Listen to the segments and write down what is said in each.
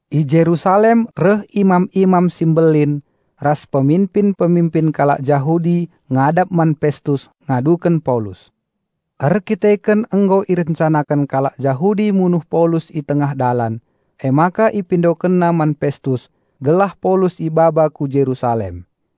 I Jerusalem reh imam-imam si mbelin ras peminpin-peminpin kalak Jahudi ngadap man Pestus ngaduken Paulus. Erkiteken nggo irencanaken kalak Jahudi munuh Paulus i tengah dalan, emaka ipindokenna man Pestus gelah Paulus ibaba ku Jerusalem.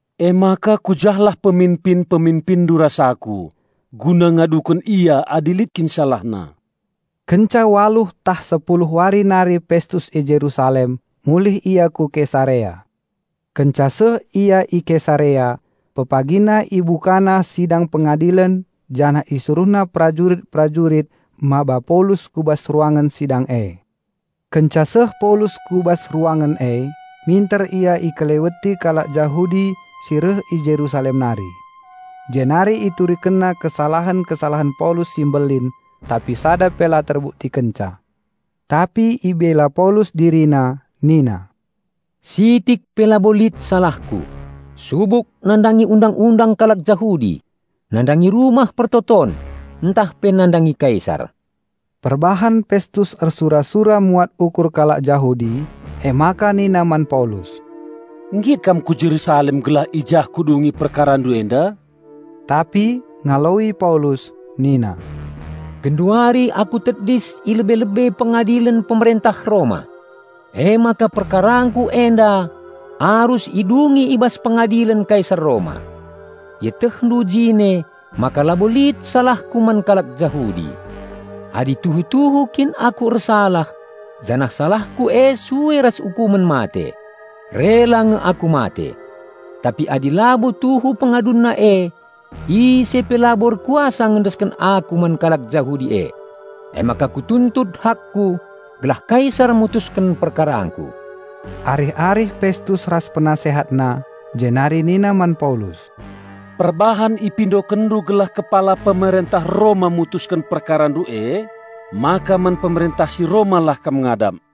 Emaka ku jah lah peminpin-peminpinndu ras aku guna ngaduken ia adi lit kin salahna." Kenca waluh tah sepuluh wari nari Pestus i Jerusalem mulih ia ku Kesarea. Kenca seh ia i Kesarea, pepagina ibukana sidang pengadilen janah isuruhna perajurit-perajurit maba Paulus ku bas ruangen sidang e. Kenca seh Paulus ku bas ruangen e, minter ia ikeleweti kalak Jahudi si reh i Jerusalem nari. Jenari iturikenna kesalahen-kesalahen Paulus si mbelin, tapi sada pe la terbuktikenca. Tapi ibela Paulus dirina nina, "Sitik pe labo lit salahku subuk nandangi Undang-undang kalak Jahudi, nandangi Rumah Pertoton ntah pe nandangi Kaisar." Perbahan Pestus ersura-sura muat ukur kalak Jahudi, emaka nina man Paulus, "Nggit kam ku Jerusalem gelah i jah kudungi perkarandu enda?" Tapi ngaloi Paulus nina, "Genduari aku tedis i lebe-lebe pengadilen Pemerentah Roma; emaka perkarangku enda arus idungi i bas pengadilen Kaisar Roma. Ietehndu jine maka labo lit salahku man kalak Jahudi. Adi tuhu-tuhu kin aku ersalah janah salahku e sue ras ukumen mate, rela nge aku mate. Tapi adi labo tuhu pengadunna e, ise pe labo erkuasa ngendesken aku man kalak Jahudi e. Emaka kutuntut hakku gelah Kaisar mutusken perkarangku." Arih-arih Pestus ras penasehatna jenari nina man Paulus, "Perbahan ipindokenndu gelah Kepala Pemerentah Roma mutusken perkarandu emaka man Pemerentah si Roma lah kam ngadap."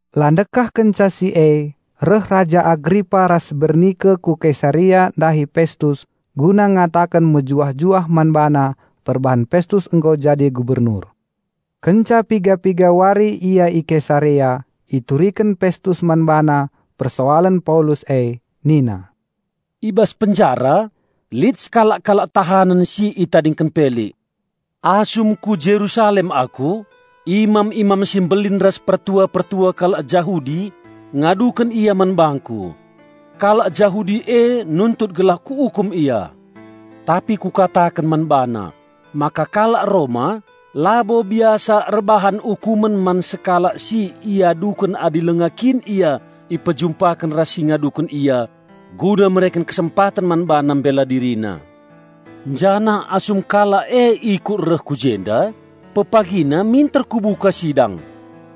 La ndekah kenca si e reh Raja Agripa ras Bernike ku Kesarea ndahi Pestus guna ngataken mejuah-juah man bana perbahan Pestus nggo jadi gubernur. Kenca piga-piga wari ia i Kesarea ituriken Pestus man bana persoalen Paulus e nina, "I bas penjara lit sekalak kalak tahanen si itadingken Pelik. Asum ku Jerusalem aku, imam-imam si mbelin ras pertua-pertua kalak Jahudi ngaduken ia man bangku. Kalak Jahudi e nuntut gelah kuukum ia. Tapi kukataken man bana maka kalak Roma labo biasa erbahan ukumen man sekalak si iaduken adi langa kin ia ipejumpaken ras si ngaduken ia guna mereken kesempaten man bana mbela dirina. Janah asum kalak e ikut reh ku jenda, pepagina minter kubuka sidang.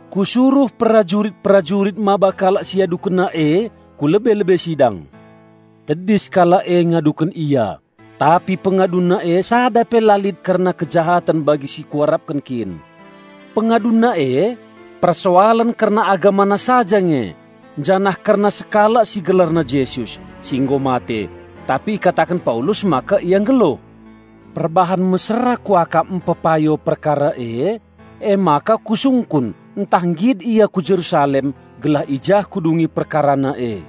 Kusuruh perajurit-perajurit maba kalak si iadukenna e ku lebe-lebe sidang. Tedis kalak e ngaduken ia, tapi pengadunna e sada pe la lit kerna kejahaten bagi si kuarapken kin. Pengadunna e, persoalen kerna agamana saja nge janah kerna sekalak si gelarna Jesus, si nggo mate, tapi ikataken Paulus maka Ia nggeluh. Perbahan mesera kuakap mpepayo perkara e, emaka kusungkun ntah nggit ia ku Jerusalem gelah i jah kudungi perkarana e.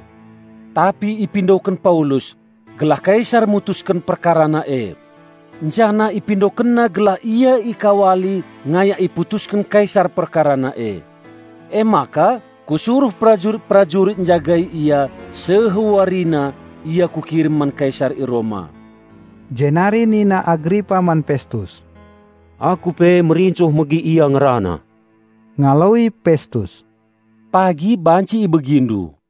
Tapi ipindoken Paulus gelah Kaisar mutusken perkarana e. Janah ipindokenna gelah ia ikawali ngayak iputusken Kaisar perkarana e. Emaka kusuruh perajurit-perajurit njagai ia seh warina ia kukirim man Kaisar i Roma." Jenari nina Agripa man Pestus, "Aku pe merincuh megi ia ngerana." Ngaloi Pestus, "Pagi banci ibegindu."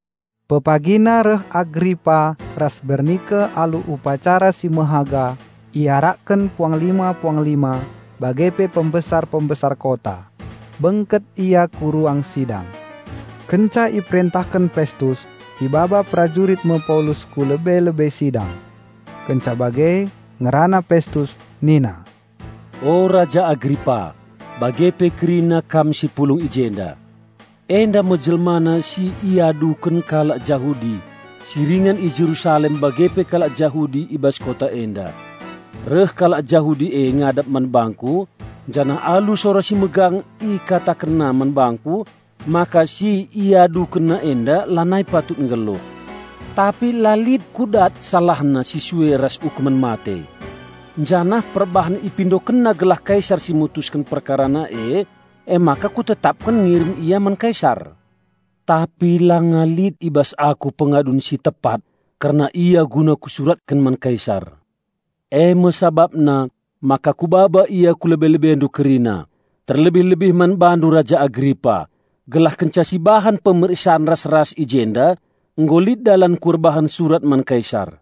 Pepagina reh Agripa ras Bernike alu upacara si mehaga iarakken puanglima-puanglima bage pe pembesar-pembesar kota. Bengket ia ku ruang sidang. Kenca iperentahken Pestus, ibaba perajurit me Paulus ku lebe-lebe sidang. Kenca bage, ngerana Pestus nina, "O Raja Agripa bage pe kerina kam si pulung i jenda. Enda me jelmana si iaduken kalak Jahudi si ringan i Jerusalem bage pe kalak Jahudi i bas kota enda. Reh kalak Jahudi e ngadap man bangku janah alu sora si megang ikatakenna man bangku maka si iadukenna enda lanai patut nggeluh. Tapi la lit kudat salahna si sue ras ukumen mate. Janah perbahan ipindokenna gelah Kaisar si mutusken perkarana e, emaka kutetapken ngirim ia man Kaisar. Tapi langa lit i bas aku pengadun si tepat kerna ia guna kusuratken man Kaisar. Eme sabapna maka kubaba ia ku lebe-lebendu kerina terlebih-lebih man bandu Raja Agripa, gelah kenca sibahan pemeriksan ras-ras i jenda, nggo lit dalanku erbahan surat man Kaisar.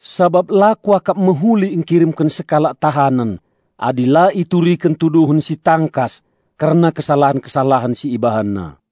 Sabap la kuakap mehuli engkirimken sekalak tahanen adi la ituriken tuduhen si tangkas kerna kesalahen-kesalahen si ibahanna."